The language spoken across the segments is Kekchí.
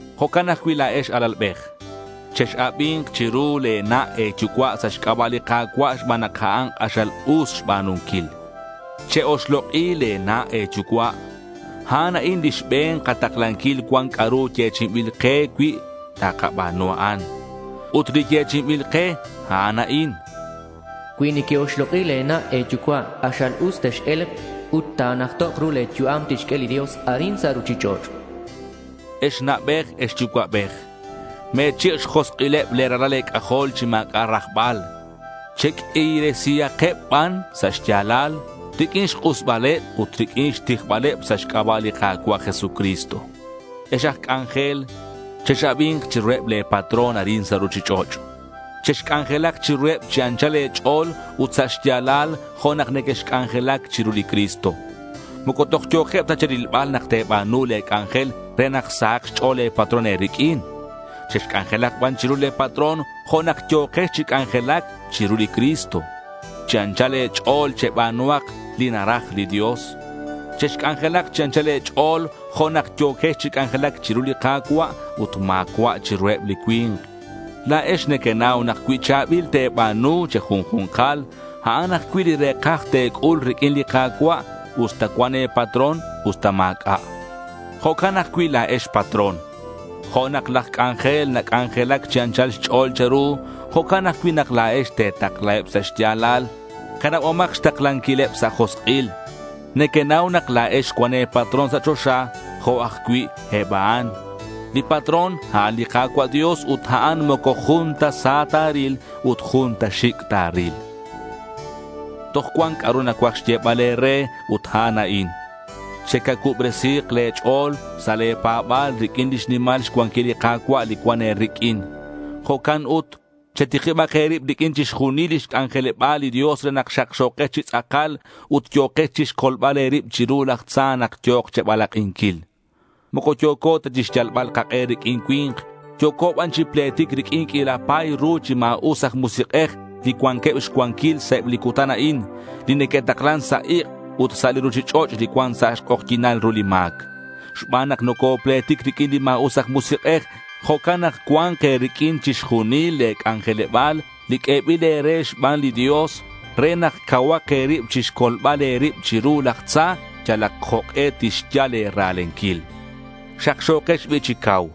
Jo'can ajcui' la̱ex, alalbej. Chex-abi̱nk chiru le̱ na' e̱yucua' sa' xc'aba' li Ka̱cua' xban nak a'an k'axal us xba̱nunquil. Che-oxlok'i le̱ na' e̱yucua'. A'an a'in lix be̱n kataklanquil cuan c'a'ru yechi'inbil ke cui takaba̱nu a'an. Ut li yechi'inbil ke, a'an a'in: Cui neque-oxlok'i le̱ na' e̱yucua', k'axal us tex-e̱lk ut ta̱najtok' ru le̱ yu'am li tixq'ue li Dios arin sa' ruchich'och'. Ex na'bej ex yucua'bej, me̱chik' xjosk'ileb le̱ ralal e̱c'ajol chi ma̱c'a' rajbal. Cheq'uiresihakeb ban sa' xya̱lal riq'uin xk'usbaleb ut riq'uin xtijbaleb sa' xc'aba' li Ka̱cua' Jesucristo. Ex aj c'anjel, chex-abi̱nk chiruheb le̱ patrón arin sa' ruchich'och'. Chexc'anjelak chiruheb chi anchal e̱ch'o̱l ut sa' xya̱lal jo' nak nequexc'anjelac chiru li Cristo. Moco toj yo̱keb ta che̱rilbal nak te̱ba̱nu le̱ c'anjel re nak sahak xch'o̱l le̱ patrón e̱riq'uin. Chexc'anjelak ban chiru le̱ patrón jo' nak yo̱kex chi c'anjelac chiru li Cristo. Chi anchal e̱ch'o̱l cheba̱nuhak li naraj li Dios. Chexc'anjelak chi anchal e̱ch'o̱l jo' nak yo̱quex chi c'anjelac chiru li Ka̱cua' ut ma̱cua' chiruheb li cui̱nk. La̱ex nequenau nak cui cha̱bil te̱ba̱nu che̱junju̱nkal a'an ajcui' li re̱kaj te̱c'ul riq'uin li Ka̱cua' usta cuan e̱patrón usta ma̱c'a'. Jo'can ajcui' la̱ex patrón, jo' nak laj c'anjel nac'anjelac chi anchal xch'o̱l che̱ru, jo'can ajcui' nak la̱ex te̱taklaheb sa' xya̱lal. Canabomak xtaklanquileb sa' josk'il. Nequenau nak la̱ex cuan e̱patrón sa' choxa jo' ajcui' eb a'an. Li patrón, a'an li Ka̱cua' Dios ut a'an moco jun ta sa ta̱ril ut jun ta xic' ta̱ril. Toj cuan c'a'ru nacuaj xyebal e̱re ut a'an a'in: Che'cacuubresi̱k le̱ ch'o̱l sa' le̱ pa̱ba̱l riq'uin lix nimal xcuanquilal li Ka̱cua' li cuan e̱riq'uin. Jo'can ut chetikibak e̱rib riq'uin chixjunil lix c'anjeleba̱l li Dios re nak xakxo̱kex chi tz'akal ut yo̱kex chixcolbal e̱rib chiru laj tza nak yo̱k che̱balak'inquil. Moco yo̱co ta chixyalbal kak'e riq'uin cui̱nk. Yo̱co ban chi pletic riq'uin q'uila pa̱y ru chi ma̱us aj musik'ej li cuanqueb xcuanquil sa' eb li cutan a'in, li neque'taklan sa' ik' ut sa' li ruchich'och' li cuan sa' xk'ojyi̱nal ru li ma̱c. Xban nak nocopletic riq'uin li ma̱us aj musik'ej, jo'can nak cua̱nk e̱riq'uin chixjunil le̱ c'anjeleba̱l li q'uebil e̱re xban li Dios re nak cauhak e̱rib chixcolbal e̱rib chiru laj tza yalak jok'e tixyal e̱ra̱lenquil. Xakxo̱kex bi' chi cau.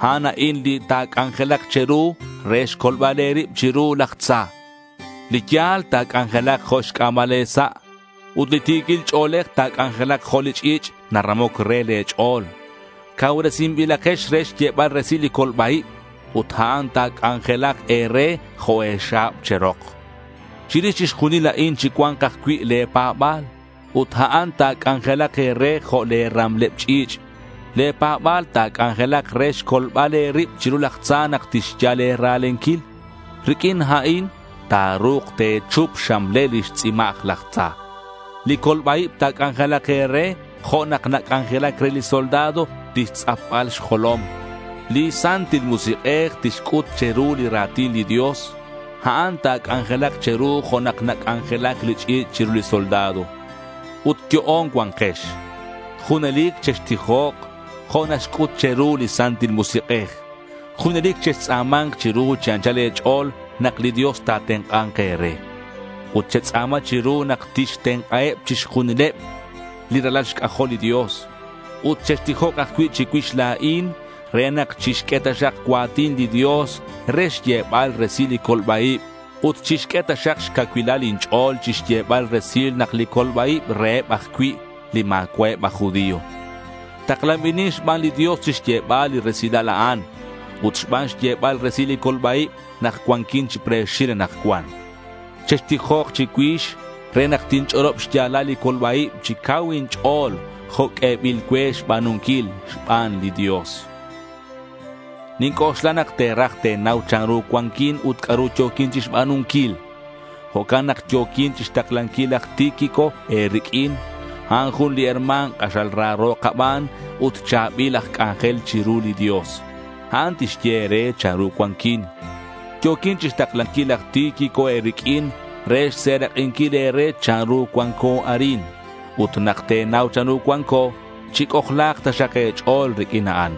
A'an a'in li ta̱c'anjelak che̱ru re xcolbal e̱rib chiru laj tza. Li ya̱l ta̱c'anjelak jo' xc'a̱mal e̱sa' ut li ti̱quil ch'o̱lej ta̱c'anjelak jo' li ch'i̱ch' naramoc re le̱ ch'o̱l. Cauresinbilakex re xyebal resil li colba-ib ut a'an ta̱c'anjelak e̱re jo' e̱xa̱b che̱rok. Chirix chixjunil a'in chicua̱nk ajcui' le̱ pa̱ba̱l. Ut a'an ta̱c'anjelak e̱re jo' le̱ ramleb ch'i̱ch'. Le̱ pa̱ba̱l ta̱c'anjelak re xcolbal e̱rib chiru laj tza nak tixyal e̱ra̱lenquil. Riq'uin a'in ta̱ru̱k te̱chup xxamlel lix tzimaj laj tza. Li colba-ib ta̱c'anjelak e̱re jo' nak nac'anjelac re li soldado lix tz'apbal xjolom. Li Santil Musik'ej tixc'ut che̱ru li ra̱tin li Dios. A'an ta̱c'anjelak che̱ru jo' nak nac'anjelac li ch'i̱ch' chiru li soldado. Ut yo'on cua̱nkex. Junelic chextijok jo' naxc'ut che̱ru li Santil Musik'ej. Junelic chextz'a̱ma̱nk chiru chi anchal e̱ch'o̱l nak li Dios ta̱tenk'a̱nk e̱re. Ut chetz'a̱ma chiru nak tixtenk'aheb chixjunileb li ralal xc'ajol li Dios. Ut chextijok ajcui' chicuix la̱in re nak chixq'ue taxak cua̱tin li Dios re xyebal resil li colba-ib ut chixq'ue taxak xcacuilal inch'o̱l chixyebal resil nak li colba-ib reheb ajcui' li ma̱cua'eb aj judío. Taklanbilin xban li Dios chixyebal li resilal a'an. Ut xban xyebal resil li colba-ib nak cuanquin chi pre̱xil anakcuan. Chextijok chicuix re nak tinch'olob xya̱lal li colba-ib chi cau inch'o̱l jo' q'uebil cue xba̱nunquil xban li Dios. Ninc'oxla nak te̱raj te̱nau chanru cuanquin ut c'a'ru yo̱quin chixba̱nunquil. Jo'can nak yo̱quin chixtaklanquil laj Tíquico e̱riq'uin. A'an jun li herma̱n k'axal raro kaban, ut cha̱bil aj c'anjel chiru li Dios. A'an tixye e̱re chanru cuanquin. Yo̱quin chixtaklanquil laj Tíquico e̱riq'uin re xserak'inquil e̱re chanru cuanco arin. Ut nak te̱nau chanru cuanco, chic'ojla̱k taxak e̱ch'o̱l riq'uin a'an.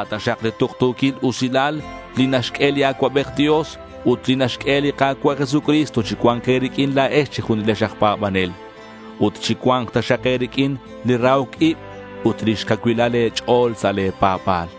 A' taxak li tuktu̱quil usilal li naxq'ue li Acuabej Dios ut li naxq'ue li Ka̱cua' Jesucristo chi cua̱nk e̱riq'uin la̱ex che̱junilex aj pa̱banel. Ut chi cua̱nk taxak e̱riq'uin li rahoc ib ut lix cacuilal e̱ch'o̱l sa' le̱ pa̱ba̱l.